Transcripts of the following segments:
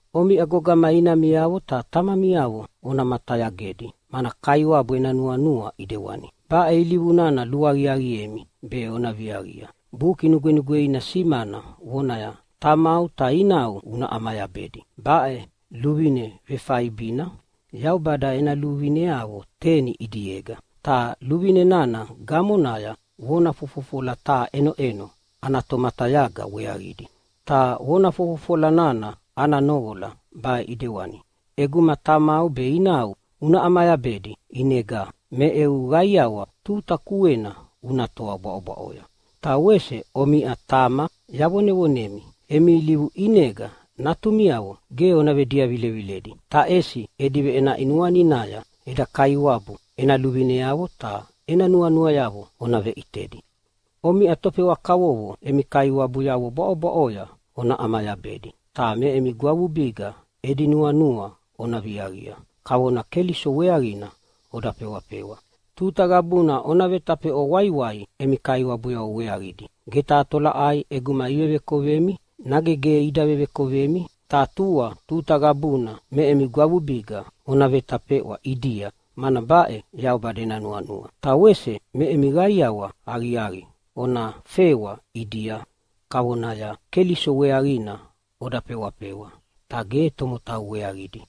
Omiʼa gogama, inamiavo ta tamamiavo ona matayagedi, mana Kaiwabu ena nuanua ʼidewani. Baʼe ilivu nana luaqiaqiemi be ona viaqia. Buki Nugwenugweina simana vonaya, “Tamau ta inau una ʼamayabedi.” Baʼe luvine vefaibina Yaubada ena luvineavo teni ʼidiega. Ta luvine nana gamonaya vona fofofola taha ʼenoʼeno ana tomatayaga weaqidi. Ta vona fofofola nana ana noqola baʼe ʼidewani: ʼEguma tamau be inau una ʼamayabedi, “ʼinega me eu qaiawa tuta kuena una toa bwaʼobwaʼoya.” Ta wese omiʼa tama yavonevonemi, emi ilivu ʼinega natumiavo ge ona vediavileviledi. Ta ʼesi edi veʼenaʼi nuaninaya eda Kaiwabu ena luvineavo ta ena nuanuayavo ona veʼitedi. Omiʼa tofewa kavovo emi kaiwabuyavo bwaʼobwaʼoya ona ʼamayabedi, ta me emi gwavubiga edi nuanua ona viaqia, kavona Keliso weaqina oda fewafewa. Tuta qabuna ona vetafeʼwa waiwai emi kaiwabuyavo weaqidi. Ge taha tolaʼai ʼeguma ivevekovemi, nage ge ida vevekovemi, ta tua tuta qabuna me emi gwavubiga ona vetafeʼwa ʼidia, mana baʼe Yaubada ena nuanua. Ta wese me emi qaiawa aqiaqi ona fewa ʼidia, kavonaya Keliso weaqina oda fewafewa ta ge tomotau weaqidi.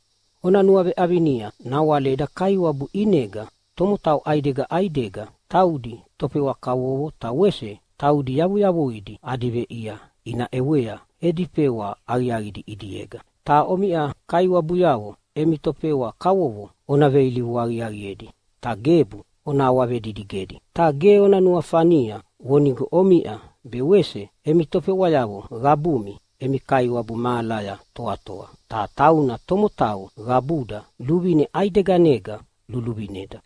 Ona nuaveʼavinia nawale eda Kaiwabu ʼinega tomotau ʼaidega ʼaidega, taudi tofewa kavovo ta wese taudi yavuyavuidi adi veʼia ina ʼewea edi fewa aqiaqidi ʼidiega. Ta omiʼa kaiwabuyavo emi tofewa kavovo ona veilivu aqiaqiedi, ta gebu ona awavedidigedi. Ta ge ona nuafania vonigo omiʼa be wese emi tofewayavo qabumi emi Kaiwabu mahalaya toatoa, ta tauna tomotau qabuda luvine ʼaideganega luluvineda.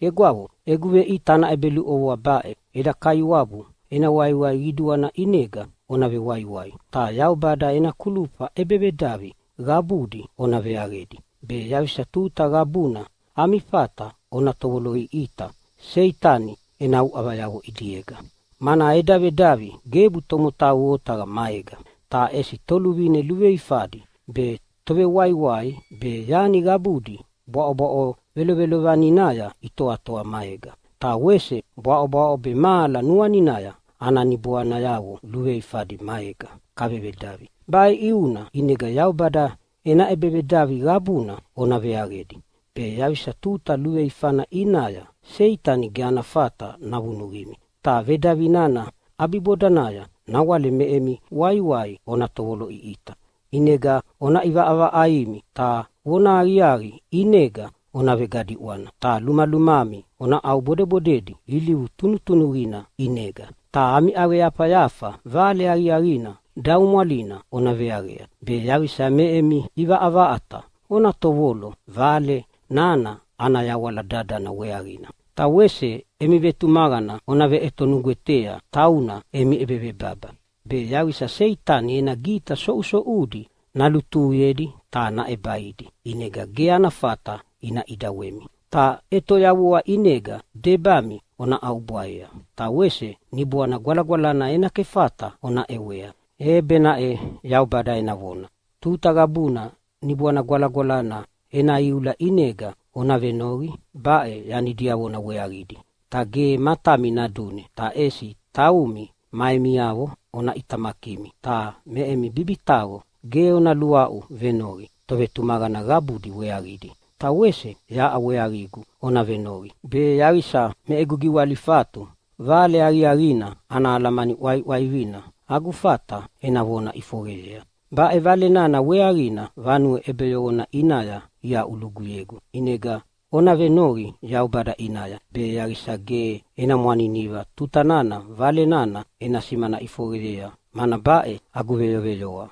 Egwavo, egu veʼita ana ʼebeluʼovoa baʼe: Eda Kaiwabu ena waiwai qiduana ʼinega ona vewaiwai. Ta Yaubada ena kulufa ʼebevedavi qabudi ona veaqedi be yaqisa tuta qabuna ami fata ona tovoloʼiʼita Seitani ena uʼavayavo ʼidiega. Mana eda vedavi gebu tomotau otaqa maega, ta ʼesi toluvine luveifadi be, tovewaiwai be, yani qabudi bwaʼobwaʼo velovelovaninaya itoatoa maega, ta wese bwaʼobwaʼo be mahala nuaninaya ana niboanayavo luveifadi maega kavevedavi. Baʼe ʼiuna ʼinega Yaubada ena ʼebevedavi qabuna ona veaqedi be yaqisa tuta luveifana ʼinaya Seitani ge ana fata navunuqimi, ta vedavi nana ʼabibodanaya nawale me emi waiwai ona tovoloʼiʼita. ʼInega ona ʼivaʼavaʼaimi ta vonahaqiaqi ʼinega ona vegadiʼwana, ta lumalumami ona ʼaubodebodedi ilivu tunutunuqina ʼinega. Ta ami ʼaqeyafayafa Vale Aqiaqina daumwalina ona veaqea, be yaqisa me emi ʼivaʼavaʼata ona tovolo Vale nana ana yawala dadana weaqina. Ta wese emi vetumaqana ona veʼetonugwetea tauna emi ʼebevebaba be yaqisa Seitani ena gita soʼusoʼudi nalutuhuyedi ta naʼebaidi ʼinega ge ana fata ina ʼidawemi. Ta ʼetoyavua ʼinega debami ona ʼaubwaea, ta wese Niboana Gwalagwalana ena kefata ona ʼewea, e benaʼe Yaubada ena vona. Tuta qabuna Niboana Gwalagwalana ena iula ʼinega ona venoqi baʼe yani diavona weaqidi. Ta ge matami nadune, ta ʼesi taumi ma emiavo ona ʼitamakimi. Ta me emi bibitaqo ge ona luaʼu venoqi tovetumaqana qabudi weaqidi. Ta wese yaʼa weaqigu ona venoqi, be yaqisa me egu giwalifatu Vale Aqiaqina ana alamani ʼwaiʼwaivina agu fata ena vona ʼifoqeyea. Baʼe Vale nana weaqina vanue ʼebeyoqona ʼinaya iaʼuluguyegu. ʼInega ona venoqi Yaubada ʼinaya, be yaqisa ge ena mwaniniva tuta nana Vale nana ena simana ʼifoqeyea, mana baʼe agu veyoveyoa.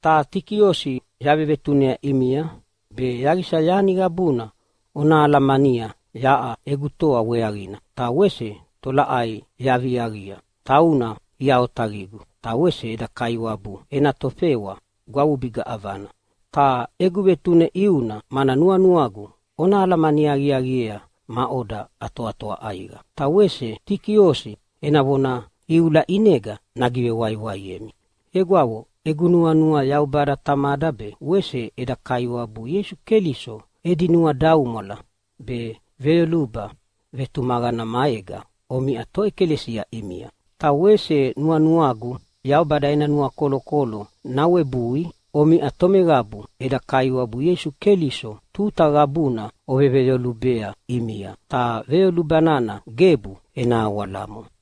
Ta Tikiosi yavevetunea ʼimia, be yaqisa yani qabuna ona alamania yaʼa egu toa weaqina ta wese tolaʼai yaviaviaqia. Tauna ia otaqigu, ta wese eda Kaiwabu ena tofewa gwavubiga ʼavana. Ta egu vetune ʼiuna mana nuanuagu ona alamani aqiaqiea maʼoda atoatoa ʼaiqa, ta wese Tikiosi ena vona iula ʼinega nagivewaiwaiemi. Egwavo, egu nuanua Yaubada Tamada be wese eda Kaiwabu Ieisu Keliso edi nuadaumwala be veyoluba vetumaqana maega omiʼa toʼekalesia ʼimia. Ta wese nuanuagu Yaubada ena nuakolokolo nawebui omiʼa tomeqabu eda Kaiwabu Ieisu Keliso tuta qabuna oveveyolubea ʼimia, ta veyoluba nana gebu ena awalamo.